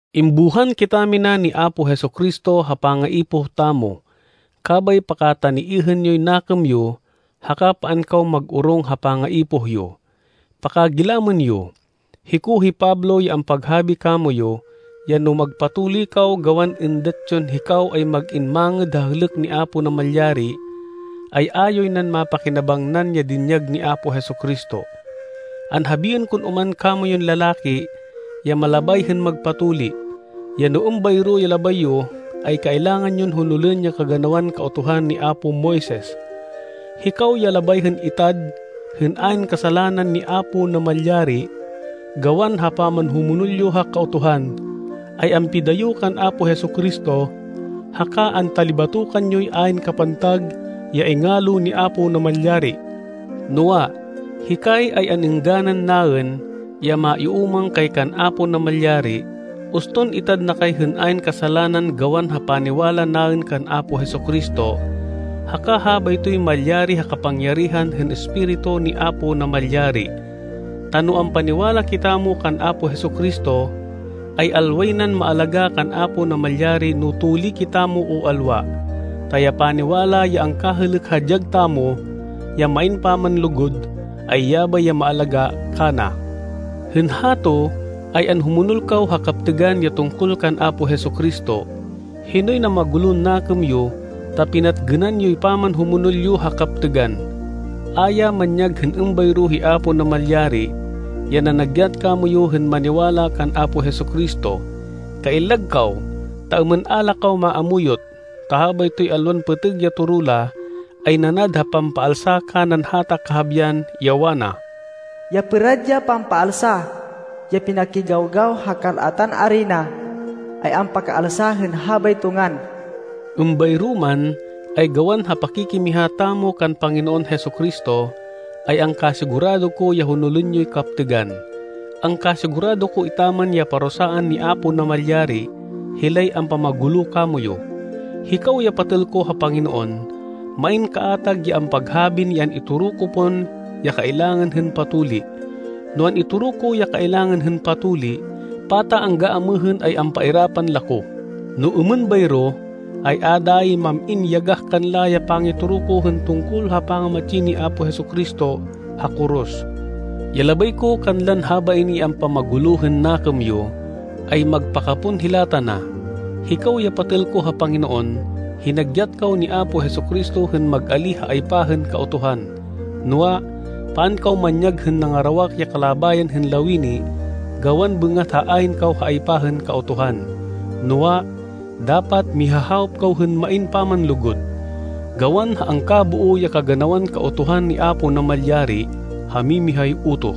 Imbuhan kitamina ni Apo Jesu-Cristo ha pangaipoh tamo. Kabay pakataniêhên yoy nakêm yo haka paan kaw mag-orong ha pangaipoh yo. Pakagilamên yo. Hiko hi Pablo ya ampaghabi kamoyu ya no magpatuli kaw gawan êndat yon hikaw ay mag-in mangêd ha hêlêk ni Apo Namalyari, ay a yoy nan mapakinabangnan ya dinyag ni Apo Jesu-Cristo. Anhabiên kon oman kamoyun lalaki ya malabay hên magpatuli, ya no êmbayro ya labay yo, ay kailangan yon honolên ya kaganawan Kautuhan ni apo Moises. Hikaw ya labay hên itad hên ayn kasalanan ni Apo Namalyari gawan ha pamanhumonol yo ha Kautuhan, ay ampidayo kan Apo Jesu-Cristo haka antalibatokan yoy ayn kapantag ya ingalo ni Apo Namalyari. Noa, hikay, ay an-êngganan naên, ya maiúmang kay kan Apo Namalyari uston itad na kay hên ayn kasalanan gawan ha paniwala naên kan Apo Jesu-Cristo, haka habaytoy malyari ha kapangyarihan hên Espiritu ni Apo Namalyari. Ta no ampaniwala kitamo kan Apo Jesu-Cristo, ay alway nan maalagá kan Apo Namalyari no tuli kitamo o alwa, ta ya paniwala ya angkahêlêk ha dyag tamo, ya main pamanlugud ay yabay ya maalagá kana. Hên hato ay anhumonol kaw ha kaptêgan ya tungkol kan Apo Jesu-Cristo. Hinoy namagulon nakêm yo ta pinatgênan yoy pamanhumonol yo ha kaptêgan? A ya manyag hên êmbayro hi Apo Namalyari, ya nanagyat kamoyu hên maniwala kan Apo Jesu-Cristo. Kaillag kaw ta êmên a la kaw maamuyot, ta habaytoy alwan pêtêg ya toro la, ay nanad ha pampaalsa kanan hata kahabian, ya wana, “Ya pêrad ya pampaalsa ya pinakigawgaw ha kal-atan arina ay ampakapaalsa hên habayto ngan.” Êmbayro man, ay gawan ha pakikimiha tamo kan Panginoon Jesu-Cristo, ay angkasigurado ko ya honolên yoy kaptêgan. Angkasigurado ko etaman ya parusaan ni Apo Namalyari hilay ampamagulo kamoyu. Hikaw ya patêl ko ha Panginoon, main kaatag ya ampaghabin ya an-itoro ko pon ya kailangan hên patuli. No an-itoro ko ya kailangan hên patuli, pata angga amêhên ay ampairapan la ko? No êmên bayro, ay a dayi mam-in yagah kanla ya pangitoro ko hên tungkol ha pangamatsi ni Apo Jesu-Cristo ha koros. Ya labay ko kanlan habain ya ampamagulo hên nakêm yo, ay magpakapon hila tana. Hikaw ya patêl ko ha Panginoon, hinagyat kaw ni Apo Jesu-Cristo hên mag-alíh ha aypa hên Kautuhan. Noa, paan kaw manyag hên nangarawak ya kalabayan hên lawini gawan bêngat ha ayn kaw ha aypa hên Kautuhan. Noa, dapat mihahawop kaw hên main pamanlugud. Gawan ha angkaboo ya kaganawan Kautuhan ni Apo Namalyari ha mimihay utoh,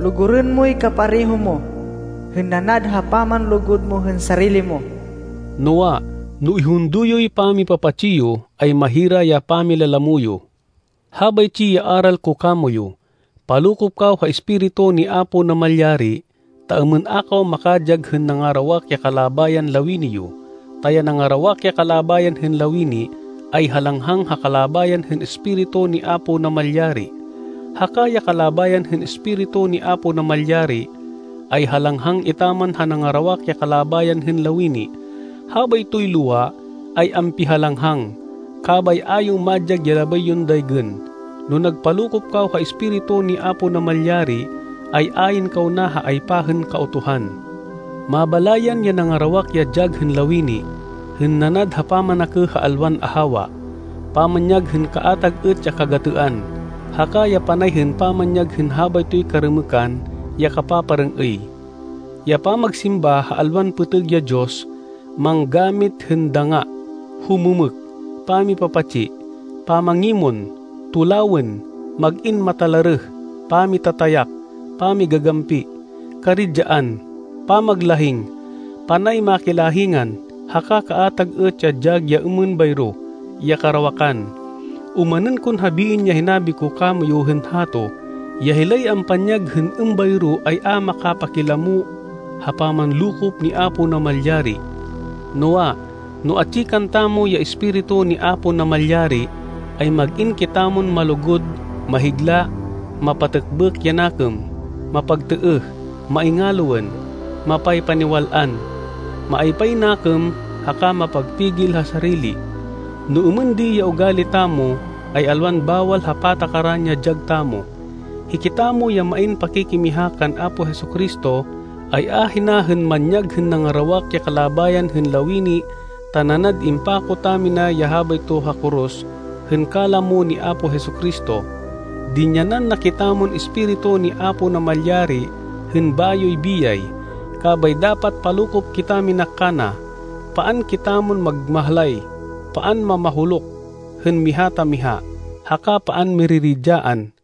“Lugurên moy kapareho mo hên nanad ha pamanlugud mo hên sarili mo.” Noa, no ihundo yoy pamipapatsi yo, ay mahira ya pamilalamo yo. Habaytsi ya aral ko kamoyu: palokop kaw ha Espiritu ni Apo Namalyari ta êmên a kaw makadyag hên nangarawak ya kalabayan lawini yo. Ta ya nangarawak ya kalabayan hên lawini, ay halanghang ha kalabayan hên Espiritu ni Apo Namalyari, haka ya kalabayan hên Espiritu ni Apo Namalyari, ay halanghang etaman ha nangarawak ya kalabayan hên lawini. Habaytoy lowa ay ampihalanghang. Kabay a yo madyag ya labay yon daygên. No nagpalokop kaw ha Espiritu ni Apo Namalyari, ay ayn kaw na ha aypa hên Kautuhan. Mabalayan ya nangarawak ya dyag hên lawini, hên nanad ha pamanakêh ha alwan ahawa, pamanyag hên kaatag êt ya kagatêan, haka ya panay hên pamanyag hên habaytoy karêmêkan ya kapaparêng-êy, ya pamagsimba ha alwan pêtêg ya diyos, manggamit hên dangá, humêmêk, pamipapatsi, pamangimon, tulawên, mag-in matalarêh, pamitatayak, pamigagampi, karidyaan, pamaglahing, panay makilahingan, haka kaatag êt ya dyag ya êmên bayro ya karawakan. Omanên kon habiên ya hinabi ko kamoyu hên hato, ya hilay ampanyag hên êmbayro ay a makapakilamo ha pamanlokop ni Apo Namalyari. Noa, no atsi kantamo ya Espiritu ni Apo Namalyari, ay mag-in kitamon malugud, mahigla, mapatêkbêk ya nakêm, mapagtêêh, maingaloên, mapaypaniwal-an, maaypay nakêm haka mapagpigil ha sarili. No êmên di ya ugali tamo ay alwan bawal ha patakaran ya dyag tamo. Hikitamo ya main pakikimiha kan Apo Jesu-Cristo ay ahina hên manyag hên nangarawak ya kalabayan hên lawini ta nanad impako tamina ya habayto ha koros hên kalamo ni Apo Jesu-Cristo. Dinyanan na kitamon Espiritu ni Apo Namalyari hên bayoy biyay, kabay dapat palokop kitamina kana. Paan kitamon magmahlay, paan mamahuluk hên miha ta miha, haka paan miriridyaan.